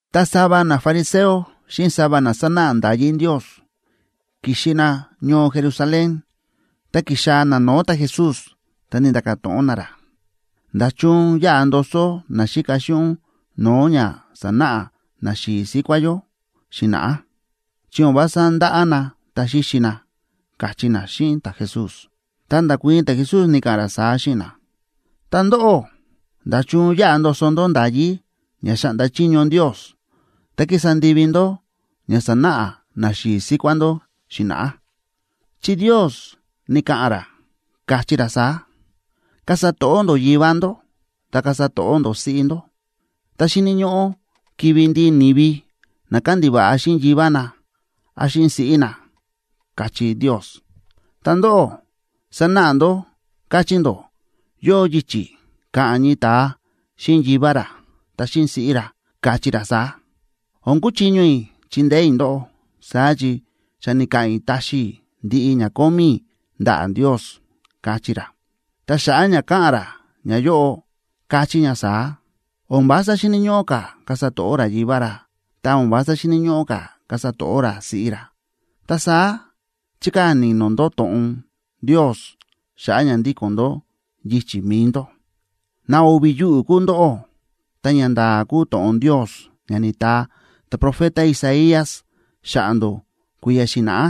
Ta sava nafariseo xíꞌin sava na sánáꞌa nda̱yí Ndios ki̱xi na ñoo Jerusalén, ta ki̱xaa̱ na no̱o̱ ta̱Jesús, ta ni̱nda̱ka̱ to̱ꞌon na ra: ―¿Nda̱chun yáꞌa ndoso naxíka xíꞌin ún no̱o̱ ña sa̱náꞌa naxi̱i̱ síkuá yó xi̱na̱ꞌá? Chi o̱n vása ndáꞌá na ta xíxi na ―káchí na xíꞌin ta̱Jesús. Ta nda̱kuii̱n ta̱Jesús, ni̱ka̱ꞌa̱n ra saá xíꞌin na: ―Ta ndóꞌó, ¿nda̱chun yáꞌa ndoso ndó nda̱yí ña xáꞌnda chiño Ndios, ta kísa ndivi ndó ña sa̱náꞌa naxi̱i̱ síkuá ndó xi̱na̱ꞌá? Chi Ndios ni̱ka̱ꞌa̱n ra, káchí ra saá: “Kasa to̱ꞌó ndó yivá ndó, ta kasa to̱ꞌó ndó siꞌí ndó”, ta “Xíni̱ ñóꞌó kivi̱ ndiꞌi ni̱vi na kándiva̱ꞌa xíꞌin yivá na án xíꞌin siꞌí na”, káchí Ndios. Ta ndóꞌó, sánáꞌa ndó káchí ndó yóo yichi̱ ka̱ꞌa̱n ñii ta̱a xíꞌin yivá ra ta xíꞌin siꞌí ra, kachí ra saá: “O̱n kúchiño i̱ chindeé i̱ ndóꞌó, saá chi xa ni̱ka̱ꞌa̱n i̱ taxi i̱ ndiꞌi ña kómí i̱ ndaꞌa̱ Ndios”, kachí ra. Ta xa̱ꞌa̱ ña káꞌa̱n ra ñayóꞌo káchí ña saá: O̱n vása xíni̱ ñóꞌó ka̱ kasa to̱ꞌó ra yivá ra, ta o̱n vása xíni̱ ñóꞌó ka̱ kasa to̱ꞌó ra siꞌí ra. Ta saá chíkaa̱ ni̱no̱ ndó to̱ꞌon Ndios xa̱ꞌa̱ ña ndíko̱n ndó yichi̱ mi̱i ndó. ¡Na o̱vi̱ yuꞌu̱ kúu ndóꞌó! Ta ñanda̱a̱ kúu to̱ꞌon Ndios ña ni̱taa ta̱profeta Isaías xa̱ꞌa̱ ndó kui̱ya̱ xi̱na̱ꞌá,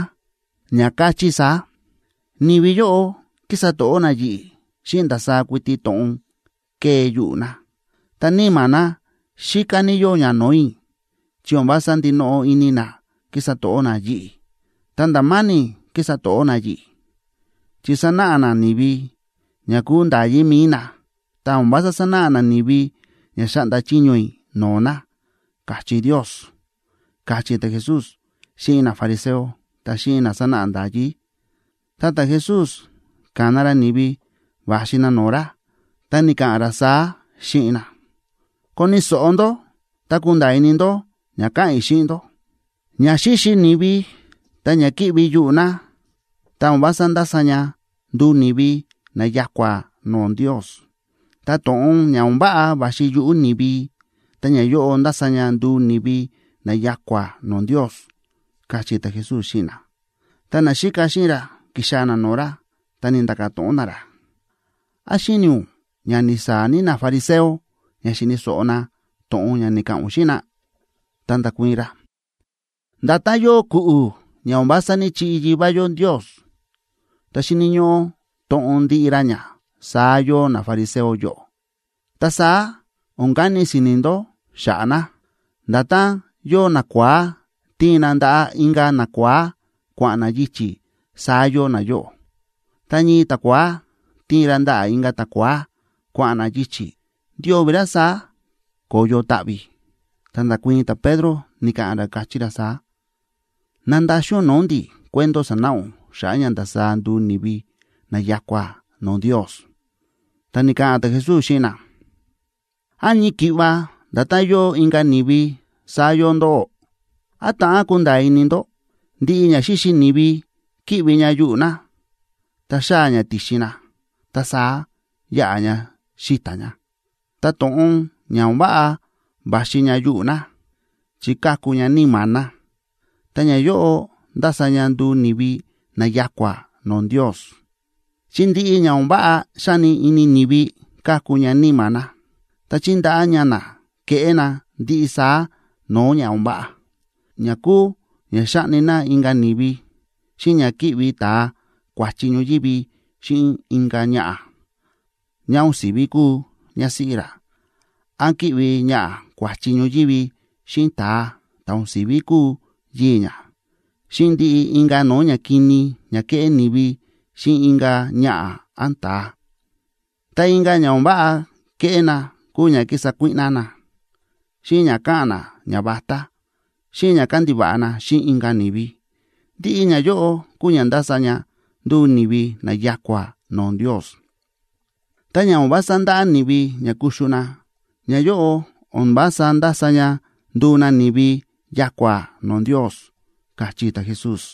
ña káchí saá: Ni̱vi yóꞌo kísa to̱ꞌó na yi̱ꞌi̱ xíꞌin ndasaá kuiti to̱ꞌon kée yuꞌu̱ na, ta níma̱ na xíká ní yóo ña no̱o̱ i̱, chi o̱n vása ndinoꞌo ini na kísa to̱ꞌó na yi̱ꞌi̱. Ta nda̱ ma̱ni̱ kísa to̱ꞌó na yi̱ꞌi̱, chi sánáꞌa na ni̱vi ña kúu nda̱yí mi̱i na, ta o̱n vása sánáꞌa na ni̱vi ña xáꞌnda chiño i̱ no̱o̱ na, káchí Ndios ―káchí ta̱Jesús xíꞌin nafariseo ta xíꞌin na sánáꞌa nda̱yí. Ta ta̱Jesús ka̱na ra ni̱vi va̱xi na no̱o̱ ra, ta ni̱ka̱ꞌa̱n ra saá xíꞌin na: ―Koni̱ so̱ꞌo ndó, ta kunda̱a̱ ini ndó ña ka̱ꞌa̱n i̱ xíꞌin ndó. Ña xíxi ni̱vi ta ña kíꞌvi yuꞌu̱ na, ta o̱n vása ndása ña nduu ni̱vi na ya̱kua̱ no̱o̱ Ndios. Ta to̱ꞌon ña o̱n váꞌa va̱xi yuꞌu̱ ni̱vi, ta ñayóꞌo ndása ña nduu ni̱vi na ya̱kua̱ no̱o̱ Ndios ―káchí ta̱Jesús xíꞌin na. Ta naxíka xíꞌin ra ki̱xaa̱ na no̱o̱ ra, ta ni̱nda̱ka̱ to̱ꞌon na ra: ―¿Án xíni̱ ún ña ni̱saa̱ ní nafariseo ña xíni̱ so̱ꞌo na to̱ꞌon ña ni̱ka̱ꞌa̱n ún xíꞌin na? Ta nda̱kuii̱n ra: ―Nda̱tán yóo ku̱ꞌu̱ ña o̱n vása ní‑chiꞌi Yivá yó Ndios, ta xíni̱ ñóꞌó toꞌon ndiꞌi ra ña, saá yóo nafariseo yóꞌo. Ta saá o̱n kani si̱ni̱ ndó xa̱ꞌa̱ na. Nda̱tán yóo nakua̱á tíin na ndaꞌa̱ inka̱ nakua̱á kua̱ꞌa̱n na yichi̱, saá yóo nayóꞌo. Tá ñii ta̱kua̱á tíin ra ndaꞌa̱ inka̱ ta̱kua̱á kua̱ꞌa̱n na yichi̱, ndio̱vi̱ ra saá ko̱yo taꞌvi̱. Ta nda̱kuii̱n ta̱Pedro, ni̱ka̱ꞌa̱n ra, káchí ra saá: ―Nandaxin ún no̱o̱ ndi̱ cuento sa̱náꞌa ún xa̱ꞌa̱ ña ndasaá nduu ni̱vi na ya̱kua̱ no̱o̱ Ndios. Ta ni̱ka̱ꞌa̱n ta̱Jesús xíꞌin na: ―¿Án ñii ki̱ꞌva nda̱tán yóo inka̱ ni̱vi, saá yóo ndóꞌó? ¿Án ta̱ꞌán kunda̱a̱ ini ndó? Ndiꞌi ña xíxi ni̱vi kíꞌvi ña yuꞌu̱ na ta xáa̱ ña ti̱xin na, ta saá yáꞌa ña xíta̱ ña. Ta to̱ꞌon ña o̱n váꞌa va̱xi ña yuꞌu̱ na chi káku ña níma̱ na, ta ñayóꞌo ndása ña nduu ni̱vi na ya̱kua̱ no̱o̱ Ndios. Chi ndiꞌi ña o̱n váꞌa xáni ini ni̱vi káku ña níma̱ na. Ta chíndaꞌá ña na keꞌé na ndiꞌi saá no̱o̱ ña o̱n váꞌa, ña kúu ña xáꞌni na inka̱ ni̱vi, xíꞌin ña kíꞌvi ta̱a kua̱chi ñoyívi xíꞌin inka̱ ñaꞌa̱ ñá o̱n si̱ví kúu ñásíꞌí ra, án kíꞌvi ñaꞌa̱ kua̱chi ñoyívi xíꞌin ta̱a ta̱ o̱n si̱ví kúu yii̱ ñá, xíꞌin ndiꞌi inka̱ no̱o̱ ñakini ña kéꞌé ni̱vi xíꞌin inka̱ ñaꞌa̱ án ta̱a. Ta inka̱ ña o̱n váꞌa kéꞌé na kúu ña kísa kuíꞌná na, xíꞌin ña káꞌa̱n na ñavatá, xíꞌin ña kándiva̱ꞌa na xíꞌin inka̱ ni̱vi. Ndiꞌi ñayóꞌo kúu ña ndása ña nduu ni̱vi na ya̱kua̱ no̱o̱ Ndios. Tá ña o̱n vása ndáꞌá ni̱vi ña kuxu na, ñayóꞌo o̱n vása ndása ña nduu na ni̱vi ya̱kua̱ no̱o̱ Ndios ―káchí ta̱Jesús.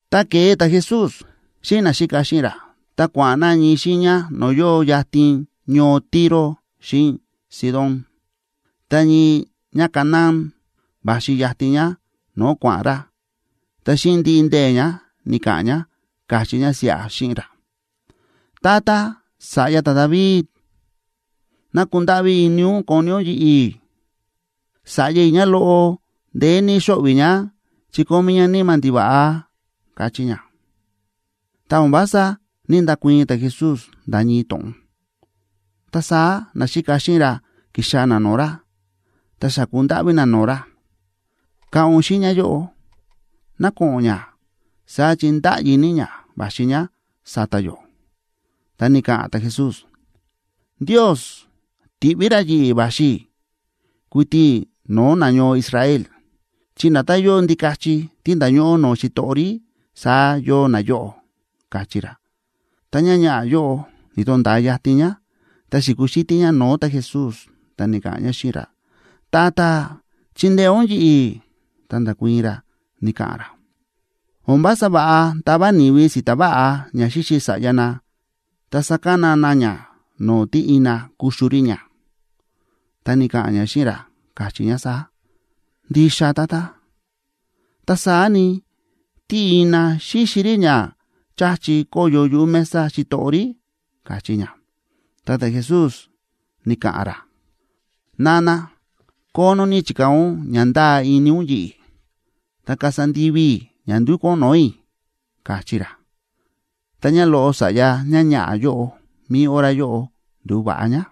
Ta ke̱e ta̱Jesús xíꞌin naxíka xíꞌin ra, ta kua̱ꞌa̱n na ñii xiiña no̱o̱ yóo yatin ñoo Tiro xíꞌin Sidón. Ta ñii ñáCanaána va̱xi yatin ñá no̱o̱ kua̱ꞌa̱n ra, ta xíꞌin ndiꞌi ndee̱ ñá ni̱ka̱ꞌa̱n ñá, káchí ñá siꞌa xíꞌin ra: ―Tata, sa̱ꞌya ta̱David, ¡ná kundáꞌví ini ún koni ún yi̱ꞌi̱! Sa̱ꞌya i̱ ñáloꞌo ndeé ní xóꞌvi̱ ñá, chi kómí ñá níma̱ ndiva̱ꞌa ―káchí ñá. Ta o̱n vása ní‑ndakuii̱n ta̱Jesús nda̱ ñii to̱ꞌon. Ta saá naxíka xíꞌin ra ki̱xaa̱ na no̱o̱ ra, ta xa̱ku ndáꞌví na no̱o̱ ra: ―Ka̱ꞌa̱n ún xíꞌin ñáyóꞌo ná ko̱ꞌo̱n ñá, saá chi ndáꞌyi ní ñá va̱xi ñá sa̱ta̱ yó. Ta ni̱ka̱ꞌa̱n ta̱Jesús: ―Ndios ti̱ꞌví ra yi̱ꞌi̱ va̱xi i̱ kuiti no̱o̱ nañoo Israel, chi nda̱tán yóo ndikachi tí nda̱ñóꞌó no̱o̱ xitoꞌo rí, saá yóo nayóꞌo ―káchí ra. Ta ñáñaꞌa̱ yóꞌo ni̱to̱nda̱a yatin ñá, ta xi̱kuxítí ñá no̱o̱ ta̱Jesús, ta ni̱ka̱ꞌa̱n ñá xíꞌin ra: ―Tata, ¡chindeé ún yi̱ꞌi̱! Ta nda̱kuii̱n ra, ni̱ka̱ꞌa̱n ra: ―O̱n vása va̱ꞌa tava ni̱vi si̱ta̱ váꞌa ña xíxi sa̱ꞌya na ta sakana na ña no̱o̱ tí ina kuxu rí ña. Ta ni̱ka̱ꞌa̱n ñá xíꞌin ra, káchí ñá saá: ―Ndixa, Tata. Ta saá ni, tí ina xíxi rí ña cha̱chi kóyo yuꞌu̱ mesa xitoꞌo rí ―káchí ñá. Ta ta̱Jesús ni̱ka̱ꞌa̱n ra: ―Nana, kónó ní chi̱kaa̱ ún ña ndáa ini ún yi̱ꞌi̱. Ta kasa ndivi i̱ ña ndúkú ún no̱o̱ i̱ ―káchí ra. Ta ñáloꞌo sa̱ꞌya ñáñaꞌa̱ yóꞌo mi̱i hora yóꞌo ndu̱va̱ꞌa ñá.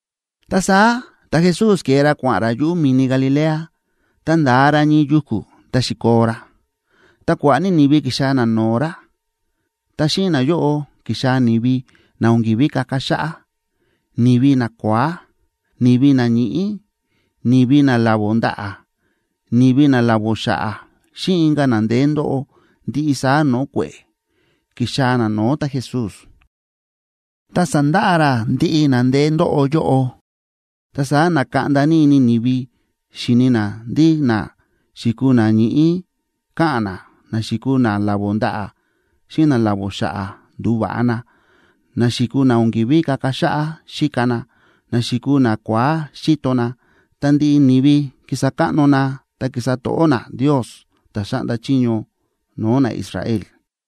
Ta saá ta̱Jesús ke̱e ra kua̱ꞌa̱n ra yuꞌu̱ mi̱ni Galilea. Ta nda̱a ra ñii yuku̱ ta xi̱koo ra. Ta kua̱ꞌa̱ ní ni̱vi ki̱xaa̱ na no̱o̱ ra, ta xíꞌin nayóꞌo ki̱xaa̱ ni̱vi na o̱n ki̱ví kaka xáꞌá, ni̱vi nakua̱á, ni̱vi na ñíꞌí, ni̱vi na lavó ndaꞌa̱, ni̱vi na lavó xa̱ꞌa̱, xíꞌin inka̱ na ndeé ndóꞌo ndiꞌi saá no̱o̱ kue̱ꞌe̱ ki̱xaa̱ na no̱o̱ ta̱Jesús. Ta sa̱ndaꞌa ra ndiꞌi na ndeé ndóꞌo yóꞌo. Ta saá na̱kaꞌnda ní ini ni̱vi xíni na ndí na xi̱kuu na ñíꞌí káꞌa̱n na, na xi̱kuu na lavó ndaꞌa̱ xíꞌin na lavó xa̱ꞌa̱ ndu̱va̱ꞌa na, na xi̱kuu na o̱n ki̱ví kaka xáꞌá xíka na, na xi̱kuu nakua̱á xíto na. Ta ndiꞌi ni̱vi ki̱sa káꞌno na ta ki̱sa to̱ꞌó na Ndios ta̱ xáꞌnda chiño no̱o̱ naIsrael.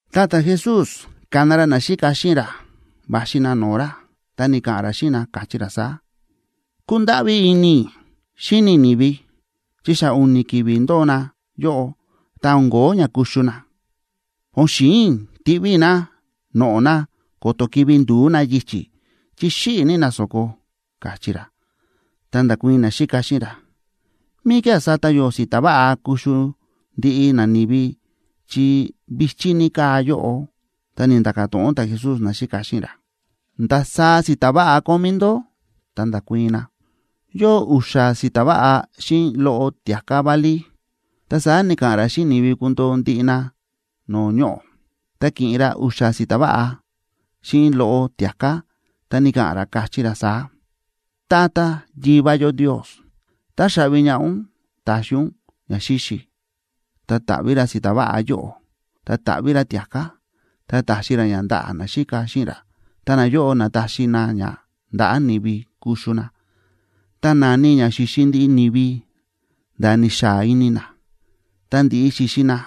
Ta ta̱Jesús ka̱na ra naxíka xíꞌin ra va̱xi na no̱o̱ ra, ta ni̱ka̱ꞌa̱n ra xíꞌin na, káchí ra saá: ―Kúndáꞌví ní ini i̱ xíni i̱ ni̱vi, chi xa u̱ni̱ ki̱vi̱ ndóo na yóꞌo ta o̱n ko̱ó ña kuxu na. O̱n xi̱in i̱ tiꞌví i̱ na noꞌo̱ na ko̱to̱ kivi̱ ndu̱ú na yichi̱, chi xíꞌi̱ ní na so̱ko ―káchí ra. Ta nda̱kuii̱n naxíka xíꞌin ra: ―¿Míkía̱ sata yó si̱ta̱ váꞌa kuxu ndiꞌi nani̱vi, chi vi̱chí ní káa yóꞌo? Ta ni̱nda̱ka̱ to̱ꞌon ta̱Jesús naxíka xíꞌin ra: ―¿Ndasaá si̱ta̱ váꞌa kómí ndó? Ta nda̱kuii̱n na: ―Yóo u̱xa̱ si̱ta̱ váꞌa xíꞌin loꞌo tia̱ká válí. Ta saá ni̱ka̱ꞌa̱n ra xíꞌin ni̱vi kundoo ndiꞌi na no̱o̱ ñoꞌo̱. Ta ki̱ꞌin ra u̱xa̱ si̱ta̱ váꞌa xíꞌin loꞌo tia̱ká, ta ni̱ka̱ꞌa̱n ra, káchí ra saá: ―Tata Yivá yó Ndios, táxaꞌvi ñaꞌá ún ta̱xi ún ñaxíxi. Ta ta̱ꞌví ra si̱ta̱ váꞌa yóꞌo, ta ta̱ꞌví ra tia̱ká, ta ta̱xi ra ña ndaꞌa̱ naxíka xíꞌin ra, ta nayóꞌo na̱taxi na ña ndaꞌa̱ ni̱vi kuxu na. Ta na̱ni ña xi̱xi ndiꞌi ni̱vi nda̱ ni̱xaa ini na. Tá ndi̱ꞌi xi̱xi na,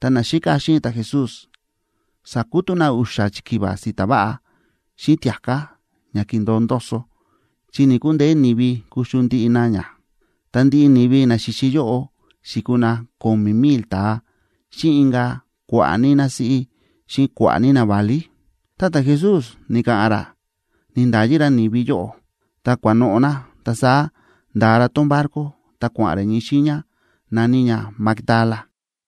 ta naxíka xíꞌin ta̱Jesús sa̱kutú na u̱xa̱ chikiva si̱ta̱ váꞌa xíꞌin tia̱ká ña ki̱ndo̱o ndoso, chi ni̱‑kundeé ni̱vi kuxu ndiꞌi na ña. Ta ndiꞌi ni̱vi na xi̱xi yóꞌo xi̱kuu na ko̱mi̱ mil ta̱a xíꞌin inka̱ kua̱ꞌa̱ ní násíꞌí xíꞌin kua̱ꞌa̱ ní naválí. Ta ta̱Jesús ni̱ka̱ꞌa̱n ra ni̱nda̱yi ra ni̱vi yóꞌo ta kua̱noꞌo̱ na, ta saá nda̱a ra tón barco, ta kua̱ꞌa̱n ra ñii xiiña na̱ní ña Magdala.